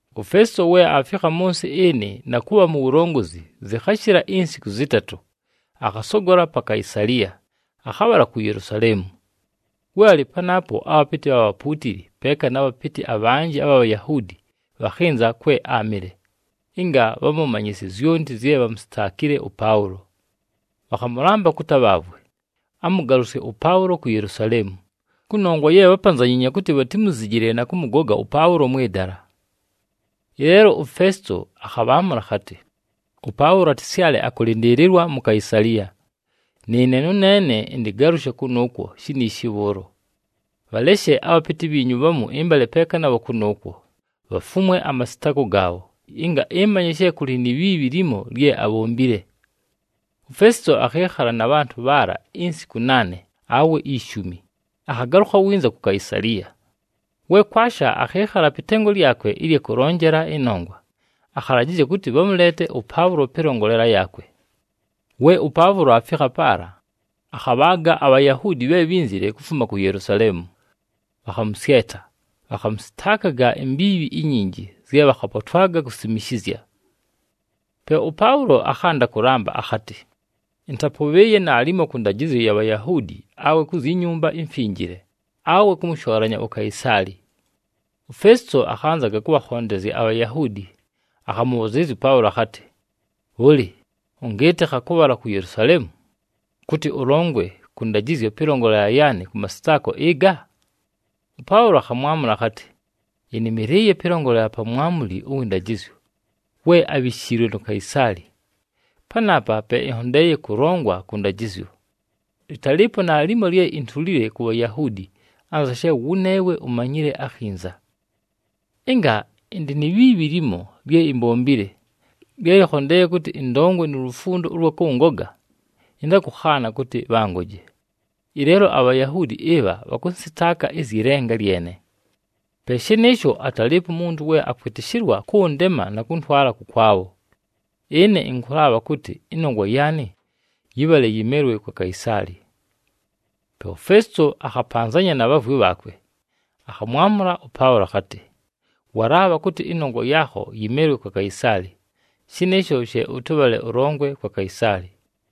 UFesito we aafikha mʉ nsɨ ɨnɨ na kʉbha mu wulongozi, zɨkhashɨla insiku zɨtatʉ, akhasogola pa Kaisaliya, akhabhala ku Yelusaleemu. We alɨ panaapo, abhapɨtɨ bha bhapuutili peeka na bhapɨtɨ abhanjɨ abha Bhayahuudi bhakhɨnza kwe áamɨle, ɨnga bhamʉmanyɨsye zyonti zye bhamusitaakile ʉPaʉlo. Bhakhamʉlamba kʉtɨ abhaavwe, amʉgalʉsye ʉPaʉlo ku Yelusaleemu, kʉnongwa ye bhápanzanyiinye kʉtɨ bhatimuzijile na kʉmʉgoga ʉPaʉlo mwɨ dala. Ɨleelo uFesito akhabhaamʉla akhatɨ, “ɄPaʉlo atɨsyale akʉlɨndɨɨlɨlwa mu Kaisaliya, nɨɨne nʉneene ɨntɨgalʉshe kʉnʉʉkwo shiniishi bhʉʉlo. Bhaleshe abhapɨtɨ bhiinyu bhamu ɨmbale peeka nabho kʉnʉʉkwo, bhafumwe amasɨtaako gaabho, ɨnga ɨmanye she kʉlɨ ni bhiibhi limo lye abhombile.” UFesito akhɨɨkhala na bhantʉ bhaala insiku naane awe ishumi, akhagalʉkha winza ku Kaisaliya. We kwasha, akhɨɨkhala pɨ tengo lyakwe ɨlya kʉlonjela ɨnongwa, akhalajɨzya kʉtɨ bhamʉleete ʉPaʉlo pɨlongolela yaakwe. We ʉPaʉlo aafikha paala, akhabhaaga aBhayahuudi bhe bhínzile kufuma ku Yelusaleemu. Bhakhamʉsyeta, bhakhamʉsɨtaakaga imbiibhi inyinji zye bhakhapotwaga kusimishizya. Pe ʉPaʉlo akhanda kʉlamba akhatɨ, “Ɨntapʉbhɨɨye naalimo kʉ ndajɨzyo ya Bhayahuudi awe ku zyi Nyumba iMfinjile, awe kʉmʉshoolanya uKaisaali.” UFesito akhanzaga kʉbhakhondezya aBhayahuudi, akhamʉbhʉzɨɨlɨzya ʉPaʉlo akhatɨ, “Bhʉlɨ, ʉngɨɨtɨkha kʉbhala ku Yelusaleemu, kʉtɨ ʉlongwe kʉ ndajɨzyo pɨlongolela yaanɨ kʉ masɨtaako ɨga?” ɄPaʉlo akhamwamʉla akhatɨ, “Ɨnɨmɨlɨɨye pɨlongolela pa mwamuli ʉwɨ ndajɨzyo we abhishiilwe nu Kaisaali, panaapa pe ɨnhondeeye kʉlongwa kʉ ndajɨzyo. Lɨtalɨɨpo naalimo lye intulile ku Bhayahuudi, anza she wʉneewe umanyile akhinza. Ɨnga ɨndɨ ni bhiibhi limo lye imbombile, lye lɨkhondeeye kʉtɨ ɨndongwe nu lufundo ʉlwa kʉngoga, ɨntakʉkhaana kʉtɨ bhangoje. Ɨleelo aBhayahuudi ɨbha bhakʉnsɨtaaka ɨzyɨ lenga lyene. Pe shɨnɨɨsho atalɨɨpo umuntu we akwɨtɨshɨlwa kʉndema na kʉntwala kʉkwabho. Ɨne ɨnkʉlaabha kʉtɨ ɨnongwa yaanɨ yɨbhale yɨmelwe kwa Kaisaali!” Pe uFesito akhapanzanya na bhaavwi bhaakwe, akhamwamʉla ʉPaʉlo akhatɨ, “Walaabha kʉtɨ ɨnongwa yaakho yɨmelwe kwa Kaisaali, shɨnɨɨsho she ʉtɨbhale ʉlongwe kwa Kaisaali!”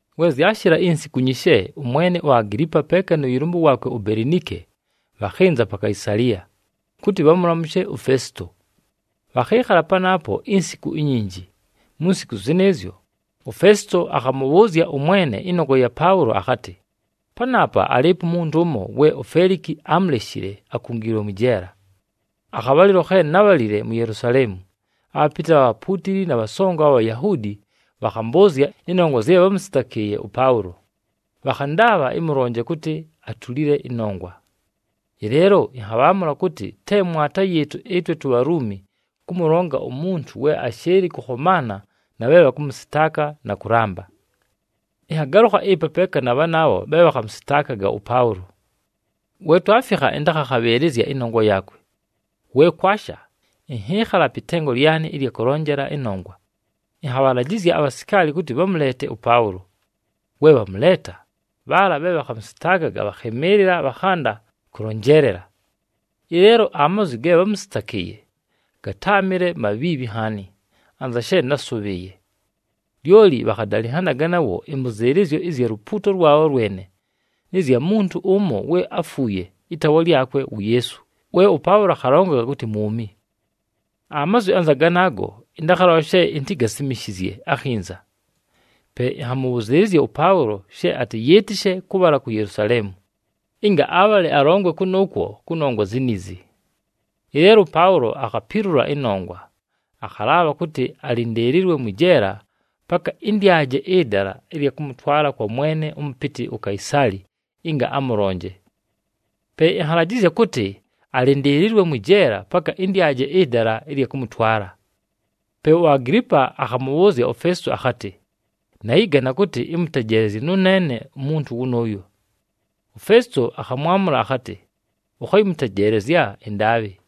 We zyashɨla insiku nyishe, ʉmwene uAgilipa peeka nʉ yɨlʉmbʉ waakwe uBelinike bhakhɨnza pa Kaisaliya, kʉtɨ bhamʉlamʉshe uFesito. Bhakhɨɨkhala panaapo insiku inyinji. Mu nsiku zɨnɨɨzyo, uFesito akhamʉbhʉʉzya ʉmwene ɨnongwa ya Paʉlo akhatɨ, “Panaapa alɨɨpo umuntu ʉmo we uFeliki ámuleshile akungiilwe mwɨ jeela. Akhabhalɨlo khe nábhalile mu Yelusaleemu, abhapɨtɨ bha bhapuutili na bhasongo abha Bhayahuudi bhakhambʉʉzya ɨnongwa zye bhámʉsɨtakɨɨye ʉPaʉlo, bhakhandaabha ɨmʉlonje kʉtɨ atulile ɨnongwa. “Ɨleelo ɨnhabhaamʉla kʉtɨ te mwata yɨɨtʉ ɨtwe tuBhaluumi kʉmʉlonga umuntu, we ashɨɨlɨ kʉkhomaana na bhe bhakʉmʉsɨtaaka na kʉlamba. Ɨnhagalʉkha ɨpa peeka na bhanaabho bhe bhakhamʉsɨtaakaga ʉPaʉlo. We twafikha, ɨntakhakhabhɨɨlɨzya ɨnongwa yaakwe. We kwasha, ɨnhɨɨkhala pɨ tengo lyanɨ ɨlya kʉlonjela ɨnongwa, ɨnhabhalajɨzya abhasikaali kʉtɨ bhamʉleete ʉPaʉlo. We bhamʉleeta, bhaala bhe bhakhamʉsɨtaakaga bhakhɨmɨɨlɨla bhakhanda kʉlonjeelela. Ɨleelo amazwi ge bhámʉsɨtakɨɨye gatáamɨle mabhiibhi nhaani, anza she násʉbhɨɨye. Lyoli bhakhadalɨnhanaga nawo ɨmbʉzɨɨlɨzyo ɨzya lupuuto lwabho lwene, nɨ zya muntu ʉmo we áfuuye, ɨtaawa lyakwe wu Yeesu, we ʉPaʉlo akhalongaga kʉtɨ mwumi. Amazwi anza ganaago, ɨntakhalola she intigasimishizye akhinza. Pe ɨnhamʉbhʉzɨɨlɨzya ʉPaʉlo she atɨyɨɨtɨshe kʉbhala ku Yelusaleemu, ɨnga abhale alongwe kʉnʉʉkwo kʉnongwa ziniizi. Ɨleelo ʉPaʉlo akhapilula ɨnongwa, akhalaabha kʉtɨ alɨndɨɨlɨlwe mwɨ jeela paka ɨndyaje ɨdala ɨlya kʉmʉtwala kwa mwene ʉmʉpɨtɨ uKaisaali ɨnga amʉlonje. Pe ɨnhalajɨzya kʉtɨ alɨndɨɨlɨlwe mwɨ jeela paka ɨndyaje ɨdala ɨlya kʉmʉtwala.” Pe uAgilipa akhamʉbhʉʉzya uFesito akhatɨ, “Nayɨgana kʉtɨ ɨmʉtejeelezye nʉneene umuntu wʉnʉʉyo.” UFesito akhamwamʉla akhatɨ, “Ʉkhayɨmʉtejeelezya ɨndaabhɨ.”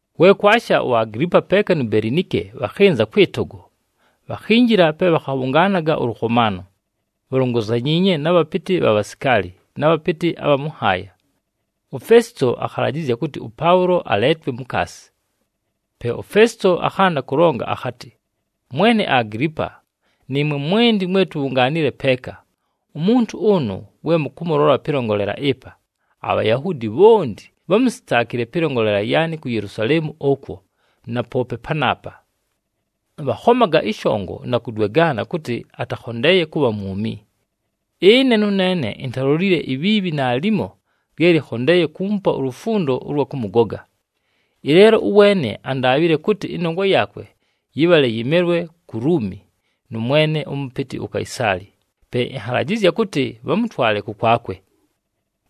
We kwasha, uAgilipa peeka nu Belinike bhakhɨnza kwɨ togo. Bhakhinjila pe bhakhabhʉngaanaga ʉlʉkhomaano, bhalongozanyiinye na bhapɨtɨ bha bhasikaali, na bhapɨtɨ abha mʉ nhaaya. UFesito akhalajɨzya kʉtɨ ʉPaʉlo aleetwe mukaasi. Pe uFesito akhanda kʉlonga akhatɨ, “Mwene Agilipa, nɨɨmwe mwenti mwe tubhungaanile peeka, umuntu ʉnʉ we mʉkʉmʉlola pɨlongolela ɨpa, aBhayahuudi bhonti bhámusitaakile pɨlongolela yaanɨ ku Yelusaleemu ʉkwo na poope panaapa. Bhakhomaga ɨshongo na kʉdwegaana kʉtɨ atakhondeeye kʉbha mwumi. Ɨne nʉneene intalilolile ibhiibhi naalimo lye lɨkhondeeye kuumupa ulufundo ʉlwa kʉmʉgoga. Ɨleelo ʉweene andaabhile kʉtɨ ɨnongwa yaakwe yɨbhale yɨmelwe ku Luumi nʉ mwene ʉmʉpɨtɨ uKaisaali, pe ɨnhalajɨzya kʉtɨ bhamʉtwale kʉkwakwe.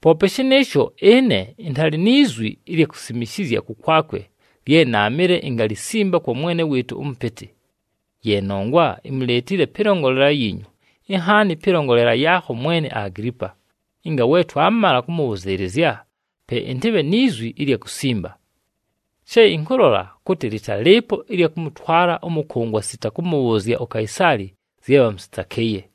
Poope shɨnɨɨsho, ɨne ɨntalɨ ni zwi ɨlya kusimishizya kʉkwakwe lye naamɨle ingalisimba kwa mwene wɨɨtʉ ʉmʉpɨtɨ. Ye nongwa imuleetile pɨlongolela yiinyu, inhaani pɨlongolela yaakho, mwene Agilipa, ɨnga we twamala kʉmʉbhʉzɨɨlɨzya pe ɨntɨbhe ni zwi ɨlya kusimba. She ɨnkʉlola kʉtɨ lɨtalɨɨpo ɨlya kʉmʉtwala ʉmʉkʉngwa sita kʉmʉbhʉʉzya uKaisaali zye bhamʉsɨtakɨɨye.”